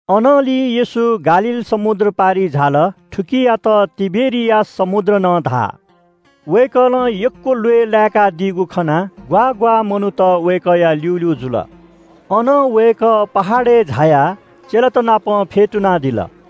अनंलि येशू गालील समुद्र पारिइ झाल। थुकियात तिबेरियास समुद्र नं धाः। वय्‌कलं यक्‍व ल्‍वय् लाय्‌कादीगु खनाः ग्‍वाः ग्‍वाः मनूत वय्‌कःया ल्‍यूल्‍यू जुल। अनं वय्‌कः पहाडय् झायाः चेलात नाप फ्‍यतुनादिल।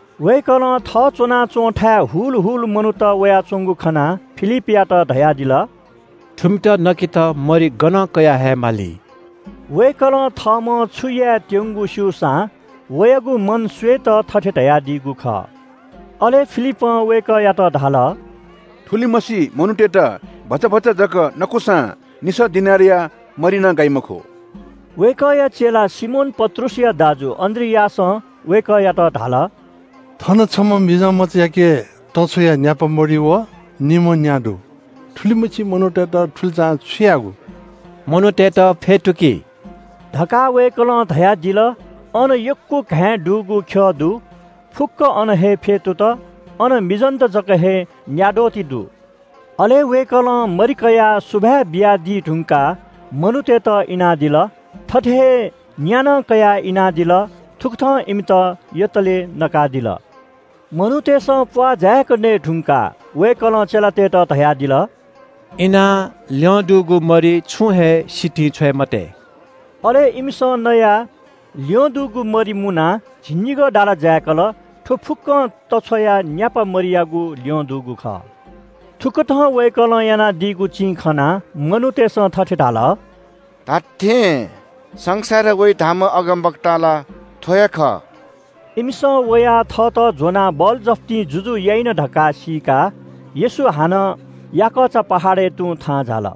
वय्‌कलं थः च्‍वनाच्‍वंथाय् हुल हुल मनूत वयाच्‍वंगु खनाः फिलिपयात धयादिल – “थुमित नकेत मरि गनं कयाहयेमाली?” वय्‌कलं थःम्‍हं छु यायेत्‍यंगु स्‍यूसां वयागु मन स्‍वयेत थथे धयादीगु खः। अले फिलिपं वय्‌कःयात धाल – “थुलिमछि मनूतय्‌त भचा भचा जक नकूसां निसः दिनारया मरि नं गाइ मखु।” वय्‌कःया चेला सिमोन पत्रुसया दाजु अन्‍द्रियासं वय्‌कःयात धाल – “थन छम्‍ह मिजंमचायाके तछ्वया न्‍यापा मरि व निम्‍ह न्‍या दु। थुलिमछि मनूतय्‌त थुलिचां छु यायेगु?” “मनूतय्‌त फ्‍यतुकि” धकाः वय्‌कलं धयादिल, अन यक्‍व घाँय् दुगु ख्‍यः दु। फुक्‍कं अन हे फ्‍यतुत। अन मिजंत जक हे न्‍याद्वः ति दु। अले वय्‌कलं मरि कयाः सुभाय् बियादी धुंकाः मनूतय्‌त इनादिल। थथे हे न्‍या नं कयाः इनादिल। थुकथं इमित यतले नकादिल। मनूतय्‌सं प्‍वाः जाय्‌क नये धुंकाः वय्‌कलं चेलातय्‌त धयादिल – “इनाः ल्‍यं दुगु मरि छुं हे सितिं छ्वये मते।” अले इमिसं नयाः ल्‍यं दुगु मुनाः मरि झिंनिगः दाला जाय्‌कल। थ्‍व फुक्‍कं तछ्वया न्‍यापा मरियागु ल्‍यं दुगु खः। थुकथं वय्‌कलं यानादीगु चिं खनाः मनूतय्‌सं थथे धाल – “धात्‍थें, संसारय् वइ धाःम्‍ह अगमवक्ता ला थ्‍व हे खः।” इमिसं वयाः थःत ज्‍वनाः बलजफ्तिं जुजु याइन धकाः सीकाः येशू हानं याकःचा पहाडय् तुं थाहां झाल।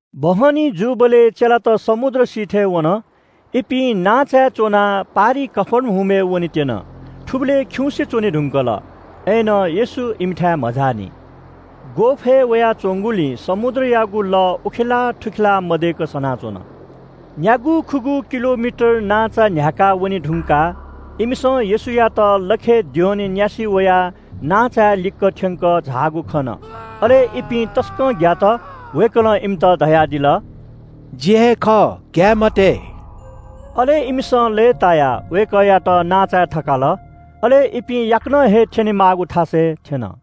बहनी जूबलय् चेलात समुद्र सिथय् वन। इपिं नांचाय् च्‍वनाः पारिइ कफर्नहुमय् वनेत्‍यन। थुबलय् खिउँसे च्‍वने धुंकल। अय्‌नं येशू इमिथाय् मझाःनि। ग्‍वःफय् वयाच्‍वंगुलिं समुद्रयागु लः उखेलाः थुखेलाः मदय्‌क सनाच्‍वन। न्‍यागू-खुगू किलोमिटर नांचा न्‍ह्याकाः वने धुंकाः इमिसं येशूयात लखय् द्यःने न्‍यासि वयाः नांचाया लिक्‍क थ्‍यंकः झाःगु खन। अले इपिं तसकं ग्‍यात। वय्‌कलं इमित धयादिल – “जि हे खः, ग्‍याये मते।” अले इमिसं लय्‌तायाः वय्‌कःयात नांचाय् थकाल। अले इपिं याकनं हे थ्‍यनेमाःगु थासय् थ्‍यन।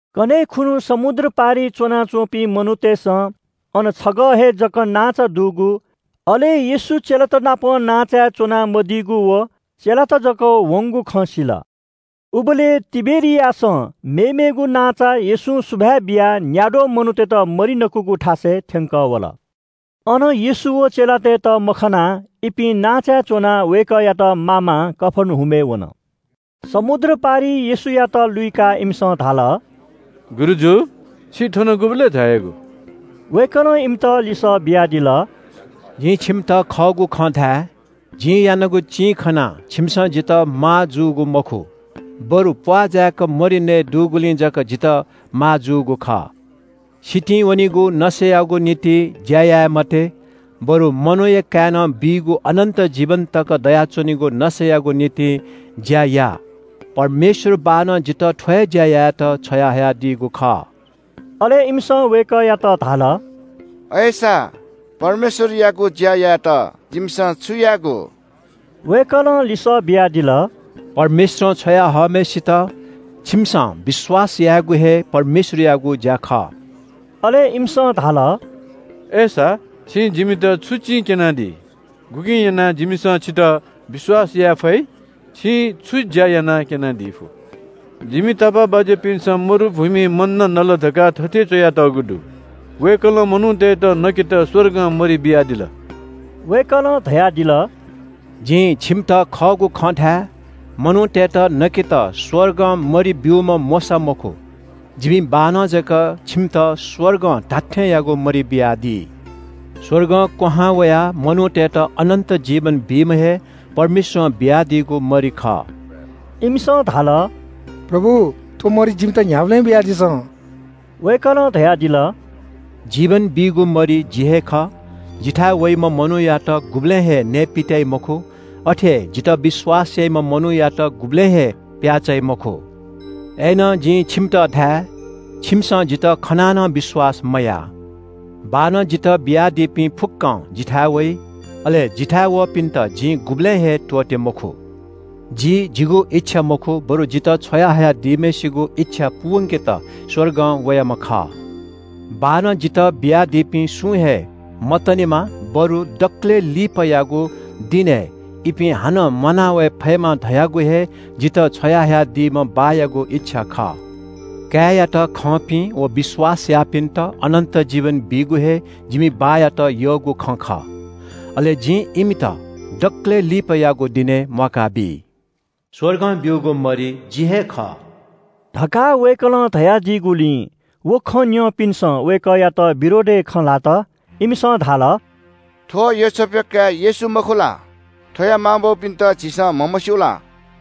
कन्‍हय् खुन्‍हु समुद्र पारिइ च्‍वनाच्‍वंपिं मनूतय्‌सं अन छगः हे जक नांचा दुगु, अले येशू चेलात नाप नांचाय् च्‍वना मदीगु, व चेलात जक वंगु खँ सिल। उबलय् तिबेरियासं मेमेगु नांचा येशूं सुभाय् बियाः न्‍याद्वः मनूतय्‌त मरि नकूगु थासय् थ्‍यंकः वल। अन येशू व चेलातय्‌त मखनाः इपिं नांचाय् च्‍वनाः वय्‌कःयात मामां कफर्नहुमय् वन। समुद्र पारिइ येशूयात लुइकाः इमिसं धाल – “गुरुजु, छि थन गुबलय् झायागु?” वय्‌कलं इमित लिसः बियादिल – “जिं छिमित खःगु खँ धाये – जिं यानागु चिं खनाः छिमिसं जितः माःजूगु मखु, बरु प्‍वाः जाय्‌क मरि नयेदुगुलिं जक जितः माःजूगु खः। सितिं वनीगु नसायागु निंतिं ज्‍या याये मते, बरु मनूया काय्‌नं बीगु अनन्‍त जीवन तक दयाच्‍वनीगु नसायागु निंतिं ज्‍या या। परमेश्‍वर बाःनं जितः थ्‍व हे ज्‍या यायेत छ्वयाहयादीगु खः।” अले इमिसं वय्‌कःयात धाल – “अय्‌सा परमेश्‍वरयागु ज्‍या यायेत जिमिसं छु यायेगु?” वय्‌कलं लिसः बियादिल – “परमेश्‍वरं छ्वया हःम्‍हय्‌सित छिकपिन्‍सं विश्‍वास यायेगु हे परमेश्‍वरयागु ज्‍या खः।” अले इमिसं धाल – “अय्‌सा छिं जिमित छु चिं क्‍यनादी? गुकिं यानाः जिमिसं छितः विश्‍वास याये फइ? छिं छु ज्‍या यानाः क्‍यनादी फु? जिमि तापाःबाज्‍यापिन्‍सं मरुभूमिइ मन्‍ना नल धकाः थथे च्‍वयातःगु दु – ‘वय्‌कलं मनूतय्‌त नकेत स्‍वर्गं मरि बियादिल।’” वय्‌कलं धयादिल – “जिं छिमित खःगु खँ धाये – मनूतय्‌त नकेत स्‍वर्गं मरि ब्‍यूम्‍ह मोशा मखु। जिमि बाःनं जक छिमित स्‍वर्गं धात्‍थेंयागु मरि बियादी। स्‍वर्गं क्‍वहां वयाः मनूतय्‌त अनन्‍त जीवन बीम्‍ह हे परमेश्‍वरं बियादीगु मरि खः।” इमिसं धाल – “प्रभु, थ्‍व मरि जिमित न्‍ह्याबलें बियादिसँ।” वय्‌कलं धयादिल – “जीवन बीगु मरि जि हे खः। जिथाय् वइम्‍ह मनूयात गुबलें हे नयेपित्‍याइ मखु। अथे हे जितः विश्‍वास याइम्‍ह मनूयात गुबलें हे प्‍याः चाइ मखु। अय्‌नं जिं छिमित धाये – छिमिसं जितः खनाः नं विश्‍वास मयाः। बाःनं जितः बियादीपिं फुक्‍कं जिथाय् वइ। अले जिथाय् वःपिन्‍त जिं गुबलें हे त्‍वःते मखु। जि जिगु इच्‍छा मखु बरु जितः छ्वया हयादीम्‍हय्‌सित इच्‍छा पूवंकेत स्‍वर्गं वयाम्‍ह खः। बाःनं जितः बियादीपिं सुं हे मतनेमा बरु दकलय् लिपायागु दिनय् इपिं हानं म्‍वाना वये फयेमा धयागु हे जितः छ्वयाहयादीम्‍ह बाःयागु इच्‍छा खः। काय्‌यात खंपिं व विश्‍वास याःपिन्‍त अनन्‍त जीवन बीगु हे जिमि बाःयात यःगु खँ खः। अले जिं इमित दकलय् लिपायागु दिनय् म्‍वाका बी।” “स्‍वर्गं ब्‍यूगु मरि जि हे खः” धकाः वय्‌कलं धयादीगुलिं व खँ न्‍यंपिन्‍सं वय्‌कःया विरोधय् खँ ल्‍हात। इमिसं धाल – “थ्‍व योसेफया काय् येशू मखु ला? थ्‍वया मांबौपिन्‍त झीसं म्‍हमस्‍यू ला?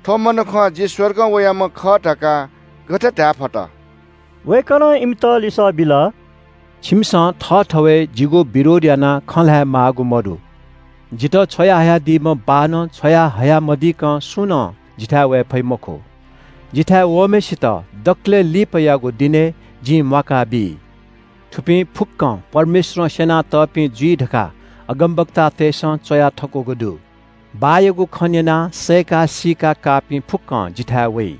थ्‍व मनुखं ‘जि स्‍वर्गं वयाम्‍ह खः’ धकाः गथे धायेफत?” वय्‌कलं इमित लिसः बिल – “छिमिसं थःथवय् जिगु विरोध यानाः खँ ल्‍हाये माःगु मदु। जितः छ्वयाहयादीम्‍ह बाःनं छ्वयाहया मदीकं सुं नं जिथाय् वये फइ मखु। जिथाय् वःम्‍हय्‌सित दकलय् लिपायागु दिनय् जिं म्‍वाका बी। थुपिं फुक्‍कं परमेश्‍वरं स्‍यना तःपिं जुइ धकाः अगमवक्तातय्‌सं च्‍वया थकूगु दु। बाःयागु खँ न्‍यनाः सय्‌का सीका काःपिं फुक्‍कं जिथाय् वइ।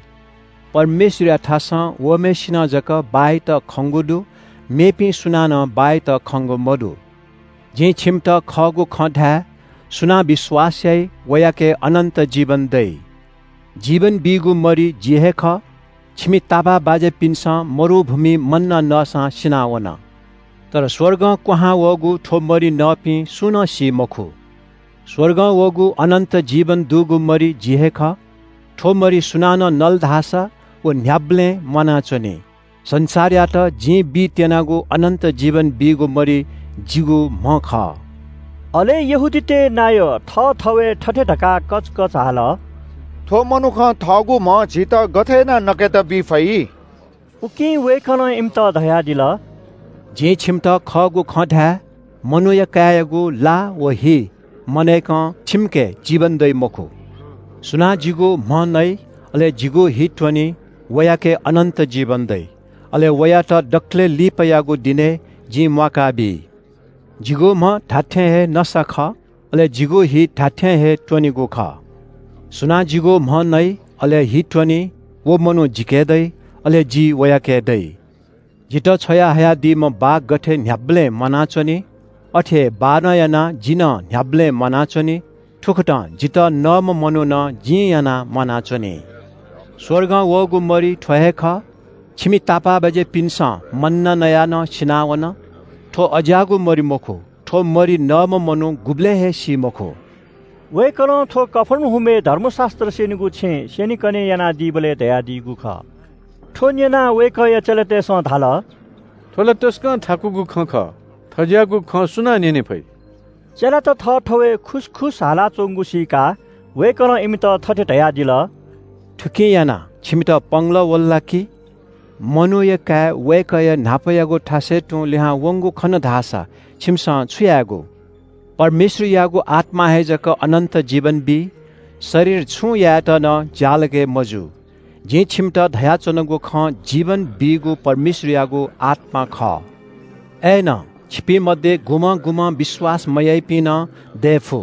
परमेश्‍वरयाथासं वःम्‍हय्‌सिनं जक बाःयात खंगु दु, मेपिं सुनानं बाःयात खंगु मदु। “जिं छिमित खःगु खँ धाये, सुनां विश्‍वास याइ, वयाके अनन्‍त जीवन दइ। जीवन बीगु मरि जि हे खः। छिमि तापाःबाज्‍यापिन्‍सं मरुभूमिइ मन्‍ना नसां सिनावन। तर स्‍वर्गं क्‍वहां वःगु थ्‍व मरि नःपिं सुं नं सी मखु। स्‍वर्गं वःगु अनन्‍त जीवन दुगु मरि जि हे खः। थ्‍व मरि सुनानं नल धाःसा व न्‍ह्याबलें म्‍वानाच्‍वनी। संसारयात जिं बीत्‍यनागु अनन्‍त जीवन बीगु मरि जिगु म्‍ह खः।” अले यहूदीतय् नायः थःथवय् थथे धकाः कचकच हाल – “थ्‍व मनुखं थःगु म्‍ह झीत गथे यानाः नकेत बी फइ?” उकिं वय्‌कलं इमित धयादिल – “जिं छिमित खःगु खँ धाये – मनूया काय्‌यागु ला व हि मनय्‌कं छिमिके जीवन दइ मखु। सुनां जिगु म्‍ह नइ, अले जिगु हि त्‍वनी, वयाके अनन्‍त जीवन दइ। अले वयात दकलय् लिपायागु दिनय् जिं म्‍वाका बी। जिगु म्‍ह धात्‍थें हे नसा खः, अले जिगु हि धात्‍थें हे त्‍वनेगु खः। सुनां जिगु म्‍ह नइ अले हि त्‍वनी, व मनू जिके दइ, अले जि वयाके दइ। जितः छ्वयाहयादीम्‍ह बाः गथे न्‍ह्याबलें म्‍वानाच्‍वनी, अथे हे बाःनं यानाः जि नं न्‍ह्याबलें म्‍वानाच्‍वनी। थुकथं जितः नःम्‍ह मनू नं जिं यानाः म्‍वानाच्‍वनी। स्‍वर्गं वःगु मरि थ्‍व हे खः। छिमि तापाःबाज्‍यापिन्‍सं मन्‍ना नयाः नं सिनावन, थ्‍व अज्‍याःगु मरि मखु, थ्‍व मरि नःम्‍ह मनू गुबलें हे सी मखु।” वय्‌कलं थ्‍व कफर्नहुमय् धर्मशास्‍त्र स्‍यनीगु छेँय् स्‍यनेकने यानादीबलय् धयादीगु खः। थ्‍व न्‍यनाः वय्‌कःया चेलातय्‌सं धाल – “थ्‍व ला तसकं थाकुगु खँ खः, थज्‍याःगु खँ सुनां न्‍यने फइ?” चेलात थःथवय् खुसखुस हालाच्‍वंगु सीकाः वय्‌कलं इमित थथे धयादिल – “थुकिं यानाः छिमित पंगलः वल ला कि? मनूया काय् वय्‌कःया न्‍हापायागु थासय् तुं लिहां वंगु खन धाःसा छिमिसं छु यायेगु? परमेश्‍वरयागु आत्‍मां हे जक अनन्‍त जीवन बी। शरीर छुं यायेत नं ज्‍यालगय् मजू। जिं छिमित धयाच्‍वनागु खँ जीवन बीगु परमेश्‍वरयागु आत्‍मा खः। अय्‌नं छिपिं मध्‍ये गुम्‍हं गुम्‍हं विश्‍वास मयाइपिं नं दये फु।”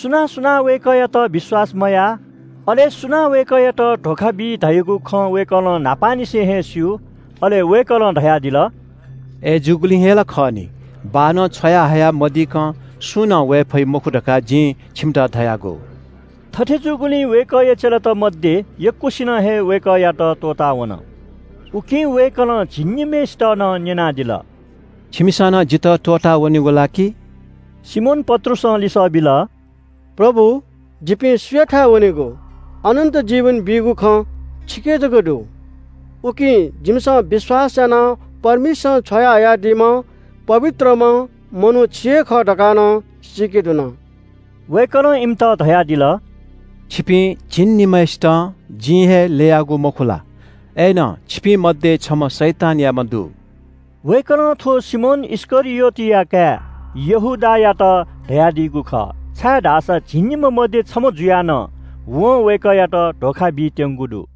सुनां सुनां वय्‌कःयात विश्‍वास मयाः, अले सुनां वय्‌कःयात धोखा बी धयागु खँ वय्‌कलं न्‍हापांनिसें हे स्‍यू। अले वय्‌कलं धयादिल – “अय्‌जूगुलिं हे ला खः नि, बाःनं छ्वयाहया मदीकं सुं नं वये फइ मखु धकाः जिं छिमित धयागु।” थथे जूगुलिं वय्‌कःया चेलात मध्‍ये यक्‍वसिनं हे वय्‌कःयात त्‍वःताः वन। उकिं वय्‌कलं झिंनिम्‍हय्‌सित नं न्‍यनादिल – “छिमिसं नं जितः त्‍वःताः वनेगु ला कि?” सिमोन पत्रुसं लिसः बिल – “प्रभु, जिपिं सुयाथाय् वनेगु? अनन्‍त जीवन बीगु खँ छिके जक दु। उकिं जिमिसं विश्‍वास यानाः परमेश्‍वरं छ्वयाहयादीम्‍ह पवित्रम्‍ह मनू छि हे खः धकाः नं सीके धुन।” वय्‌कलं इमित धयादिल – “छिपिं झिंनिम्‍हय्‌सितं जिं हे ल्‍ययागु, मखु ला? अय्‌नं छिपिं मध्‍ये छम्‍ह शैतानयाम्‍ह दु।” वय्‌कलं थ्‍व सिमोन इस्‍करियोतया काय् यहूदायात धयादीगु खः, छाय्‌धाःसा झिंनिम्‍ह मध्‍ये छम्‍ह जुयाः नं वं वय्‌कःयात धोखा बीत्‍यंगु दु।